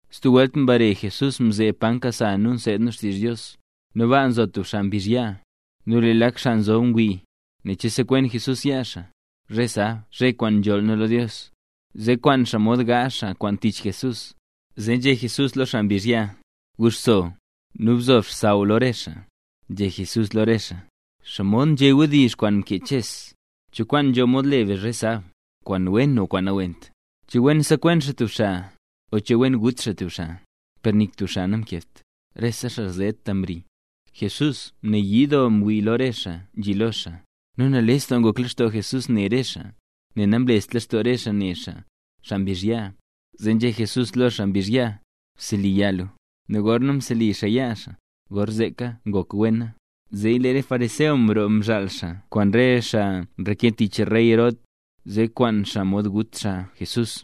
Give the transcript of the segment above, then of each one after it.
Stub welt mbare Jesús mzeeb pa nkasa nu seed nu xtizh Dios, nu baa nzo tub xaa mbizh yaa. Nu lee lak xaa nzob ngwii, ne che sekwen Jesús yaa xaa, zhe sab, zhe kwaan nzholl nu lo Dios, zee kwaan xaa mod gaazh xaa kwaan tich Jesús. Zee nzhé Jesús lo xaa mbizh yaa: —Guxso, nu bzo xsaww lo rese xaa. Nzhé Jesús lo re xaa: —¿Xomod nzhé wdizh kwaan mkee Ches? ¿Cho kwaan nzho mod le be zhe sab, kwaan wen o kwaan nawent? ¿Che wen sekwen xaa tub xaa, o che wen gut xaa tub xaa? Per nik tub xaa namkebt, rese xaa zheta mri. Jesús mnayii doo mwii lo re xaa nzhi lo xaa, nu nales doo ngok lextoo Jesús ne re xaa, nel namlest lextoo re xaa ne xaa, xaa mbizh yaa. Zee nzhé Jesús lo xaa mbizh yaa: —Bseli yaa lu. Nu gorna mseli xaa yaa xaa, gorzeeka ngokwena. Zee lee re xaa fariseo mroo mzhaal xaa kwaan re xaa nreke tich rey Herod, zee mkwaan xaa mod gut xaa Jesús.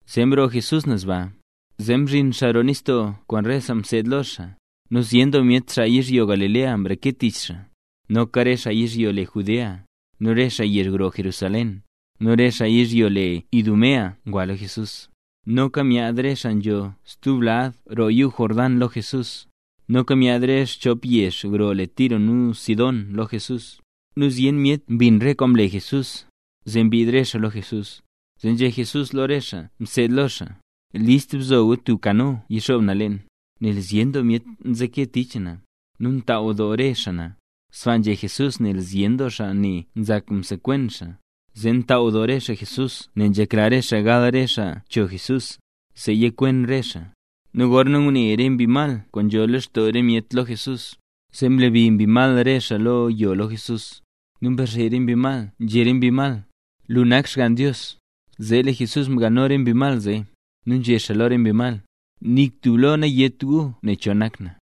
Zee mroo Jesús naz baa, zee mzhin xaa roo nistoo kwaan re xaa mseed lo xaa. Nu zyen doo myet xaa yizhyo Galilea mreke tich xaa. Noka re xaa yizhyo le Judea, nu re xaa yezh gro Jerusalén, nu re xaa yizhyo le Idumea ngwa lo Jesús; noka myaad re xaa nzho stub lad roo yuu Jordán lo Jesús, noka myaad re xaa xchop yezh gro le Tiro nu Sidón lo Jesús. Nu zyen myet mbin re kwaan mle Jesús, zee mbiid re xaa lo Jesús. Zee nzhé Jesús lo re xaa mseed lo xaa: —List bzo gu tub kano yixoob na leen, nel zyen doo myet nzeke tich na, nu ntaaw doo re xaa na. Sbaa nzhé Jesús nel zyen doo xaa ne nzak msekwen xaa, zee mtaaw doo re xaa Jesús nel nzhekla re xaa gal re xaa cho Jesús, zee yikwen re xaa. Nu gorna ngune re mbi mal kwaan nzho lextoo re myet lo Jesús, zee mlebi mbi mal re xaa lo yo lo Jesús, nu mrazhe re mbi mal, nzhé re mbi mal: —Lu nak Xgann Dios. Zee lee Jesús mgalno re mbi mal zee, nu nzhé xaa lo re mbi mal: —Nik tub lo nayét gu nen cho nak na.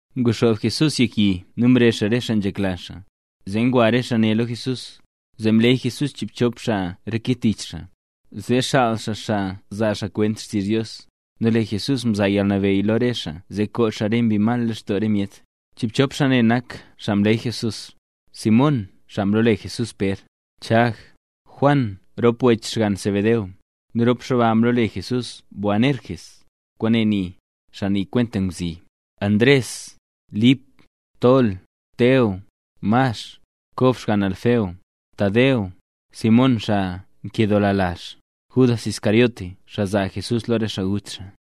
Nguxoob Jesús yek yi nu mrezh xaa re xaa nzhekla xaa, zee ngwa re xaa ne lo Jesús. Zee mleey Jesús chiibchop xaa reke tich xaa, zee xaal xaa xaa zaa xaa kwent xtizh Dios. Nu lee Jesús mzaa yalnabeyy lo re xaa zee koo xaa re mbi mal lextoo re myet. Chiibchop xaa ne nak xaa mleey Jesús: Simón (xaa mlole Jesús Pér), Chag, Juan (rop wech xgann Zebedeo, nu rop xaa ba mlole Jesús Boanerges, kwaane nii: “Xaa nii kwenta ngwzi”); Ndres, Lip, Tol, Teo, Max, Chag (xgann Alfeo), Tadeo, Simón (xaa nkedoola lazh), Judas Iscariote (xaa zaa Jesús lo re xaa gut xaa).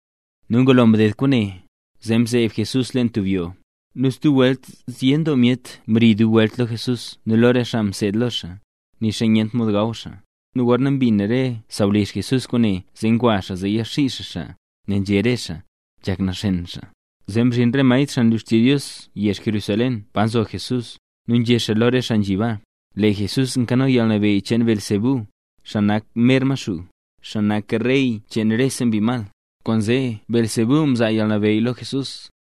Nu ngulo mded kwaane, zee mzeeb Jesús leen tub yoo. Nu stub welt zyen doo myet mri dub welt lo Jesús nu lo re xaa mseed lo xaa, nixa nyent mod gaw xaa. Nu gorna mbin re sawlizh Jesús kwaane zee ngwa xaa zee yaxii xaa xaa, nel nzhé re xaa: —Nzhak naxen xaa. Zee mzhin re maestr xaa nlu xtizh Dios yezh Jerusalén pa nzo Jesús, nu nzhé xaa lo re xaa nzhi baa: —Lee Jesús nkano yalnabeyy cheen Beelzebú, xaa nak mer Maxuu, xaa nak rey cheen rese mbi mal, kwaanzee Beelzebú mzaa yalnabeyy lo Jesús,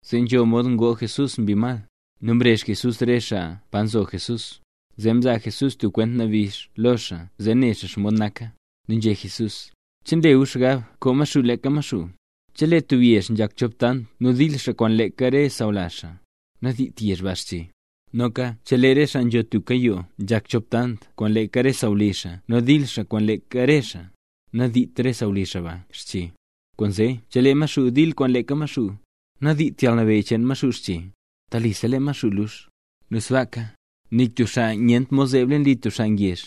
zee nzho mod ngoo Jesús mbi mal. Nu mrezh Jesús re xaa pa nzo Jesús, zee mzaa Jesús tub kwent nabix lo xaa zee ne xaa xomod naka. Nu nzhé Jesús: —¿Che nle gu xgab koo Maxuu leeka Maxuu? Chelee tub yezh nzhak chop tant nu dil xaa kwaan leeka re sawlazh xaa, nadiit yezh ba xche. Noka chelee re xaa nzho tubka yoo nzhak chop tant kwaan leeka re sawlizh xaa nu ndil xaa kwaan leeka re xaa, nadiit re sawlizh xaa ba xche. Kwaanzee chelee Maxuu dil kwaan leeka Maxuu, nadiit yalnabeyy cheen Maxuu xche. Telisa lee Maxuu lux. ’Nu sbaaka, nik tub xaa nyent mod zeeb leen li tub xaa ngezh,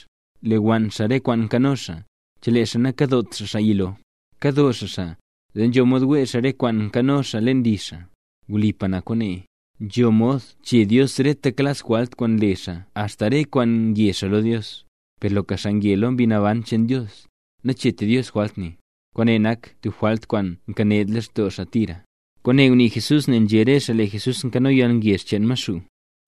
lewann xaa rese kwaan nkano xaa, chelee xaa nakadot xaa xaa yilo. Kado xaa xaa, zee nzho mod wee xaa re kwaan nkano xaa leen li xaa. ’Wlipa na kwaane. Nzho mod chee Dios reta klas jwalt kwaan nle xaa axta re kwaan nge xaa lo Dios. Per loka xaa nge lo Mbi Naban cheen Dios, nacheetra Dios jwalt ne. Kwaane nak tub jwalt kwaan nkened lextoo xaa tira. Kwaane ngunii Jesús nel nzhé re xaa lee Jesús nkano yalngezh cheen Maxuu.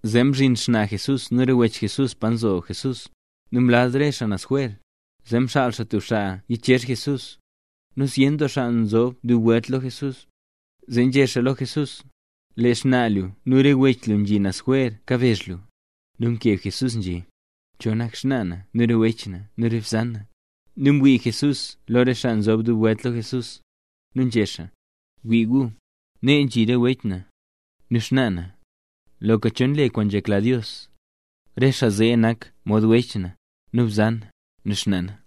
Zee mzhin xnaa Jesús nu re wech Jesús pa nzo Jesús. Nu mlaz re xaa naz jwer, zee mxaal xaa tub xaa yichezh Jesús. Nu zyen doo xaa nzob dub welt lo Jesús, zee nzhé xaa lo Jesús: —Lee xnaa lu nu re wech lu nzhi naz jwer kabezh lu. Nu mkeb Jesús nzhé: —¿Cho nak xnaa na nu re wech na nu re bzan na? Nu mwii Jesús lo re xaa nzob dub welt lo Jesús, nu nzhé xaa: —Wii gu, nee nzhi re wech na, nu xnaa na. Loka cho nle kwaan nzhekla Dios, re xaa zee nak mod wech na, nu bzan na, nu xnaa na.